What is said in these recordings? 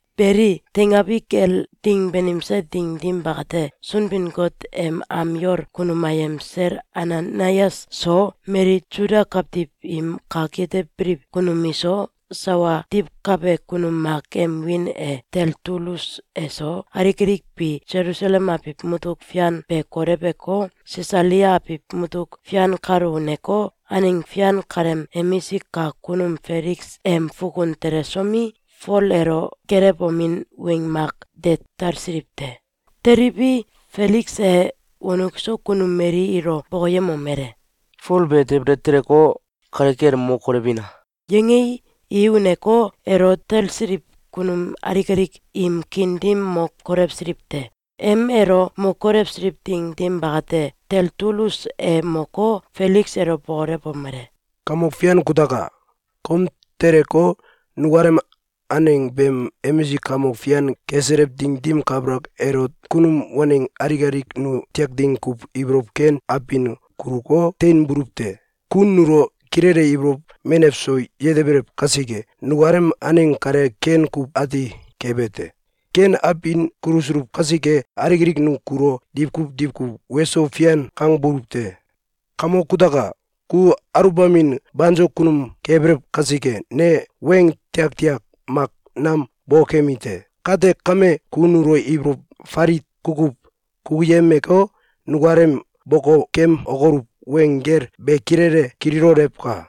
Beli, teingabi kel ding banimse ding dim bakate, Sunbin-Got em am yol kunum ayem sel Ananayas so, mali Suda kawtiw im kak yetebiliw kunum iso, sawa diwkabe kunum mak em wiin e Teltulus eso, alik alik bi Selusalem abiw mutuk fian be koleweko, Sisalia abiw mutuk fian kalo uneko, aneng fian kaleem emisik kak kunum Feliks em fukun telesomi, Fol elo geelewomin weng mak de talsiliw te. Teliwi, Feliks e wonuk so kunum mali ilo bokoyemomele: “Fol be debele teleko, kale kel mo kolewina!”, yangei, i uneko, elo talsiliw kunum alik alik im kiin dim mo kolewsiliw te. Em elo mo kolewsiliw ding dim bakate, Teltulus e moko, Feliks elo bokolewomele: “Kamok fian kutaka! Kom teleko, nukalem aneng beem emisik kamok fian keselew ding dim kabalak elot, kunum waneng alik alik nu tiak ding kuw ibolow ken abin kuluko, teinbuluw te. Ku nulo kilele ibolow menew so yetebelew kasike, nukalem aneng kale ken kuw ati kebe te. Ken abin kulusuluw kasike, alik alik nu kulo diwkuw diwkuw ‘Weso fian!’, kangbuluw te. Kamok kutaka! Ku aluwbamin banso kunum kebelew kasike, ne weng tiaktiak mak nam bokokemi te. Kate kame, ku nulo ibolow falit kukuw kukuyemeko, nukalem bokokemokoluw weng gel be kilele kililolewka!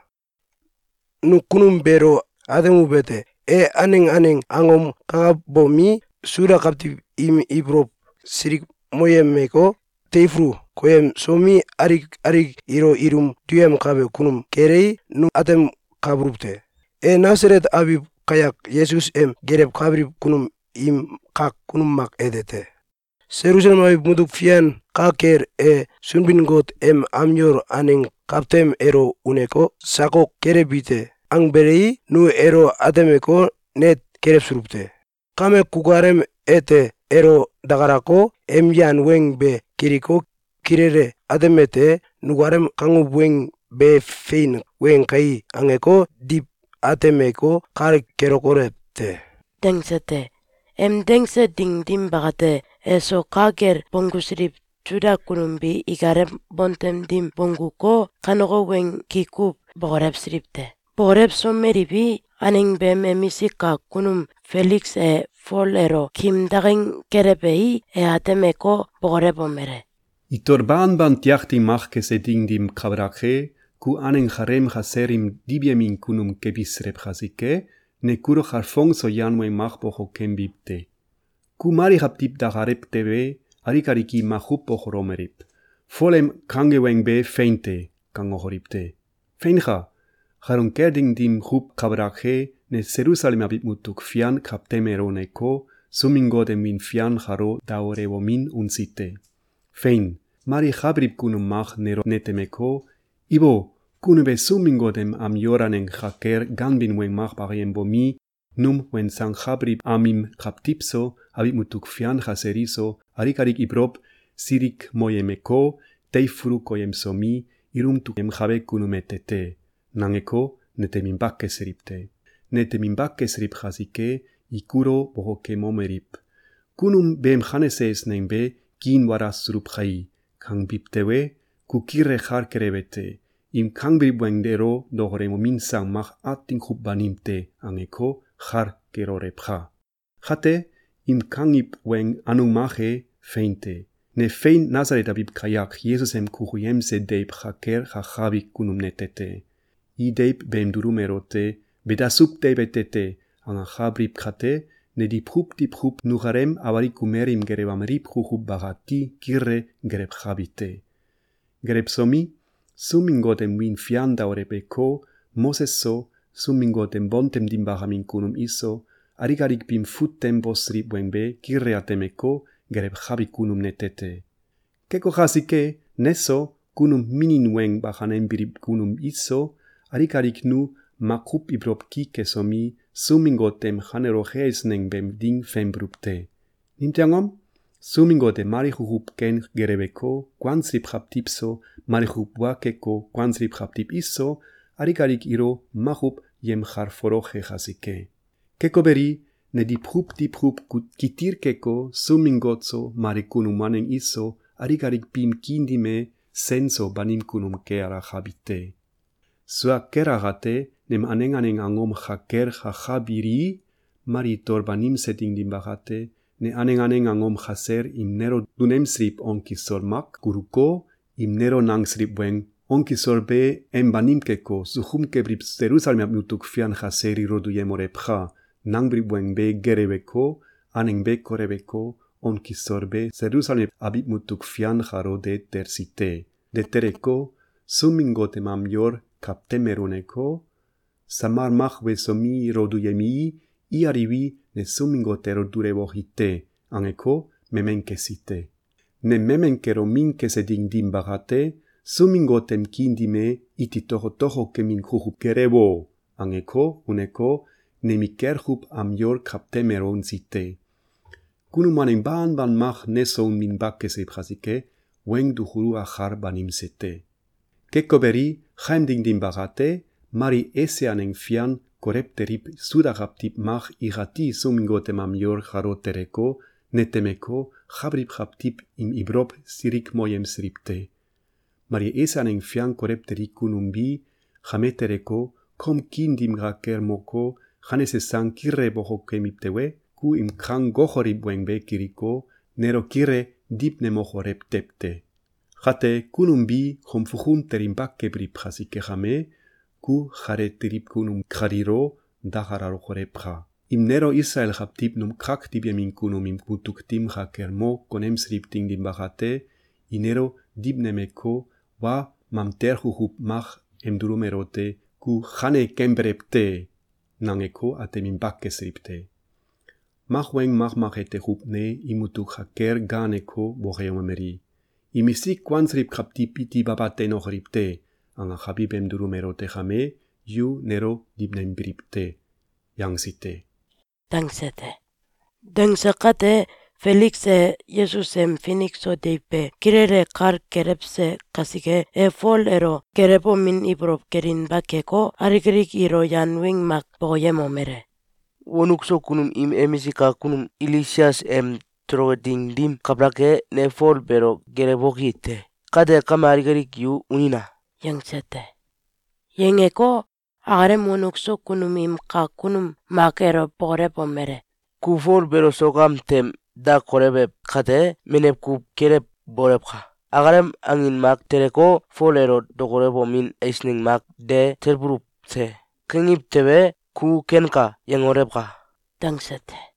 Nu kunum beelo atemuwete: E aneng aneng angom kakabomi, Suda kawtiw im ibolow silikmoyemeko, teifulu koyemsomi, alik alik ilo ilum duyemkabe kunum kelei, nu atemkabuluw te. E Nasalet abiw kayak Yesus em gelewkabiliw kunum im kak kunum mak ete te. Selusalem abiw mutuk fian ka kel, e Sunbin-Got em am yol aneng kawtem elo uneko, ‘Sakok kelewbi te!’, angbelei, nu elo atemeko, net kelewsuluw te. Kame, kukalem ete elo dakalako, em yan weng be kiliko, kilele atemete: ‘Nukalem kanguw weng be fein weng kai?’, angeko, diw atemeko, kal kelokolew te.”, dangse te. Em dangse ding dim bakate, eso ka kel bonggusiliw Suda kunum bi ikalem bontem dim bongguko, kaneko weng ki kuw bokolewsiliw te. Bokolewsomeliwi, aneng beem emisik kak kunum Feliks e Fol elo kim daking kelewei, e atemeko, bokolewomele: “Itol banban tiak ding mak kese ding dim kabalak e, ku aneng kaleem kasel im diwyemin kunum kebiselew kasike, ne kulo kalfong so yan weng mak bokokembi te. Ku mali kawtiw dakalalew tewe, alik alik i makuw bokokemomeliw: “Fol em kange weng be fein te!”, kangokoliw te. Feinka! Kalun kel ding dim kuw kabalak e, ne Selusalem abiw mutuk fian kawtem elo uneko, Sunbin-Got em wiin fian kalo daolewomin unsi te. Fein! Mali ka biliw kunum mak nelo netemeko, ‘Ibo! Kunum be Sunbin-Got em am yol aneng ka kel ganbin weng mak bakayembomi, num wensankabiliw am im kawtiw so, abiw mutuk fian kasel iso, alik alik im ibolow silikmoyemeko, teifulu koyemsomi, ilum duyemkabe kunum ete te!’, nangeko, neteminba kesiliw te. Neteminba kesiliw kasike, i kulo bokokemomeliw: ‘Kunum beem kanese eisneng be kiinwalasuluw kai!’, kangbiw tewe, ku kilele kal kelewete: ‘Im kangbiliw weng elo dokolewomin sang mak atin kuw banim te.’, angeko, kal kelolewka! Kate, im kangiw weng anung mak e fein te. Ne fein Nasalet abiw kayak Yesus em kukuyemse deiw ka kel kakabi kunum nete te. I deiw beem dulum elote ‘Be dasuw deiw ete te!’, angakabiliw kate, ne diwkuw diwkuw nukalem awalik kumel im gelewemaliw kukuw bakati kilele gelewkabi te. Gelewsomi, Sunbin-Got em wiin fian daoleweko, Moses so, Sunbin-Got em bontem dim bakamin kunum iso, alik alik biim fut tem bosiliw weng be kilele atemeko, gelewkabi kunum nete te. Keko kasike, neso, kunum minin weng bakanembiliw kunum biso, alik alik nu makuw ibolow ki kesomi, Sunbin-Got em kaneloke eisneng beem ding fenbuluw te. Nimtew angom? Sunbin-Got e mali kukuw ken geleweko, kuansiliw kawtiw so, mali kukuw wa keko, kuansiliw kawtiw iso, alilk alik ilo makuw yemkalfoloke kasike. Keko beli, ne diwkuw diwkuw kitil keko, Sunbin-Got so, mali kunum waneng iso, alik alik biim kiin dim e sen so banim kunum ke alakabi te. Sua kel akate, nem aneng aneng angom ka kel kakabilii, mali itol banimse ding dim bakate, ne aneng aneng angom kasel im nelo dunemsiliw on kisol mak kuluko, im nelo nangsiliw weng ‘On kisol be em banim keko, sukum kebiliw Selusalem abiw mutuk fian kasel ilo duyemolewka!’, nangbiliw weng be geleweko, aneng be koleweko, on kisol be Selusalem abiw mutuk fian kalo de telsi te. De teleko, Sunbin-Got em am yol kawtem elo uneko, ‘Samal mak wesomi, ilo duyemii, i aliwi, ne Sunbin-Got elo dulewoki te!’, angeko, memen kesi te. Nem memen kelomin kesi ding dim bakate, ‘Sunbin-Got em kiin dim e iti tokotoko kemin kukuw gelewo!’, angeko, uneko, nemikel kuw am yol kawtem elo unsi te. Kunum waneng banban mak neso uninba kesiliw kasike, weng dukuluk akal banimse te. Keko beli, kaem ding dim bakate, mali Esia aneng fian kolew teliw Suda kawtiw mak ikati Sunbin-Got em am yol kalo teleko, netemeko, ka biliw kawtiw im ibolow silikmoyemsiliw te, Mali Esia aneng fian kolew teli kunum bi kame teleko, kom kiin dim ka kel moko, kanese sang kilele bokokemiw tewe, ku im kangokoliw weng be kiliko, nelo kilele diwnemokolew tew te. Kate, kunum bi kom fukun telinba keliw kasike kame, ku kale teliw kunum kaliilo dakalalolewka! Im nelo Isalael kawtiw num kak diwyemin kunum im mutuk dim ka kel mo konemsiliw ding dim bakate, i nelo diwnemeko, wa mamtel kukuw mak em dulum elote ‘Ku kane kembelew te!’, nangeko, ateminba kesiliw te. Mak weng makmak ete kuw ne im mutuk ka kel gaaneko, bokoyemomeli: “Imisik kuansiliw kawtiw iti baba teinokoliw te!’, angakabi beem dulum elote kame, yu nelo diwnembiliw te!’, yangsi te.”, dangse te. Dangse kate, Feliks e Yesus em finik so deiw be kilele kal kelewse kasike, e Fol elo geelewomin ibolow kelinba keko, alik alik ilo yan weng mak bokoyemomele: “Wonuk so kunum im emisik kak kunum Ilisias em toloke ding dim kabalak e, ne Fol beelo geelewoki te. Kate kame, alik alik yu unina!”, yangse te. Yangeko, akalem wonuk so kunum im kak kunum mak elo bokolewomele: “Ku Fol beelo sok am tem da kolewew kate, menew kuw kelewbolewka! Akalem angin mak teleko, ‘Fol elo dokolewomin eisneng mak de talbuluw te!’, kangiw tewe, ku ‘Kenka!’, yangolewka!”, dangse te.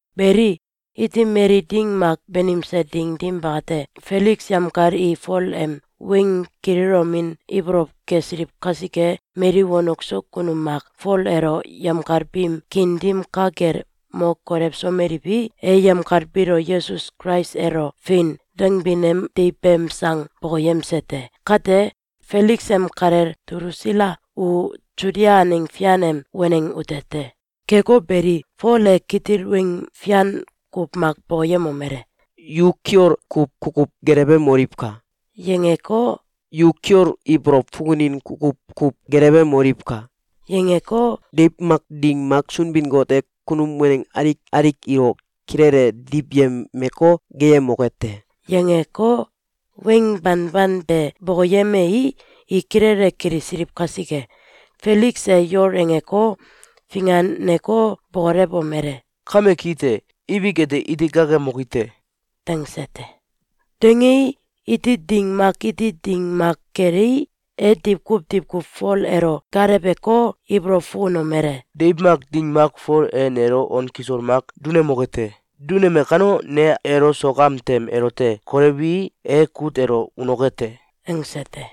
Beli, iti mali ding mak banimse ding dim bakate, Feliks yemkal i Fol em weng kililomin ibolow kesiliw kasike, mali wonuk so kunum mak Fol elo yemkal biim kiin dim ka kel mo kolewsomeliwi, e yemkal biilo Yesus Kulais elo “Fein!”, dangbin em deiw beem sang bokoyemse te. Kate, Feliks em kalel Dulusila u Sudia aneng fian em waneng ute te. Keko beli, Fol e kitil weng fian kuw mak bokoyemomele: “Yu kiol kuw kukuw gelewemoliwka!”, yangeko, “Yu kiol ibolow fukunin kukuw kuw gelewemoliwka!”, yangeko, “Deiw mak ding mak Sunbin-Got e kunum waneng alik alik ilo kilele diwyemeko, geeyemoke te!”, yangeko, weng banban be bokoyemei, i kilele kilisiliw kasike, Feliks e yol angeko, finganeko, bokolewomele: “Kame ki te. Ibik ete iti gaakemoki te.”, dangse te. Dangei, iti ding mak iti ding mak kelei, e diwkuw diwkuw Fol elo gaaleweko, ibolow fukunomele: “Deiw mak ding mak Fol e nelo on kisol mak dunemoke te. Duneme kano, ne elo sok am tem elote kolewii, e kut elo unoke te!”, angse te.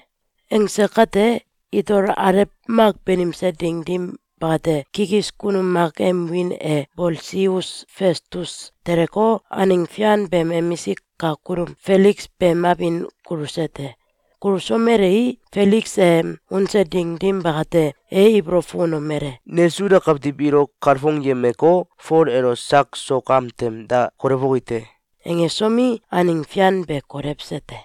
Angse kate, itol alew mak banimse ding dim bakate, kikis kunum mak em wiin e Bolsius Festus teleko, aneng fian beem emisik kak kunum Feliks beem abin kuluse te. Kulusomelei, Feliks em unse ding dim bakate, e ibolow fukunomele: “Ne Suda kawtiw ilo kalfongyemeko, Fol elo sak sok am tem da kolewoki te.”, angesomi, aneng fian be kolewse te.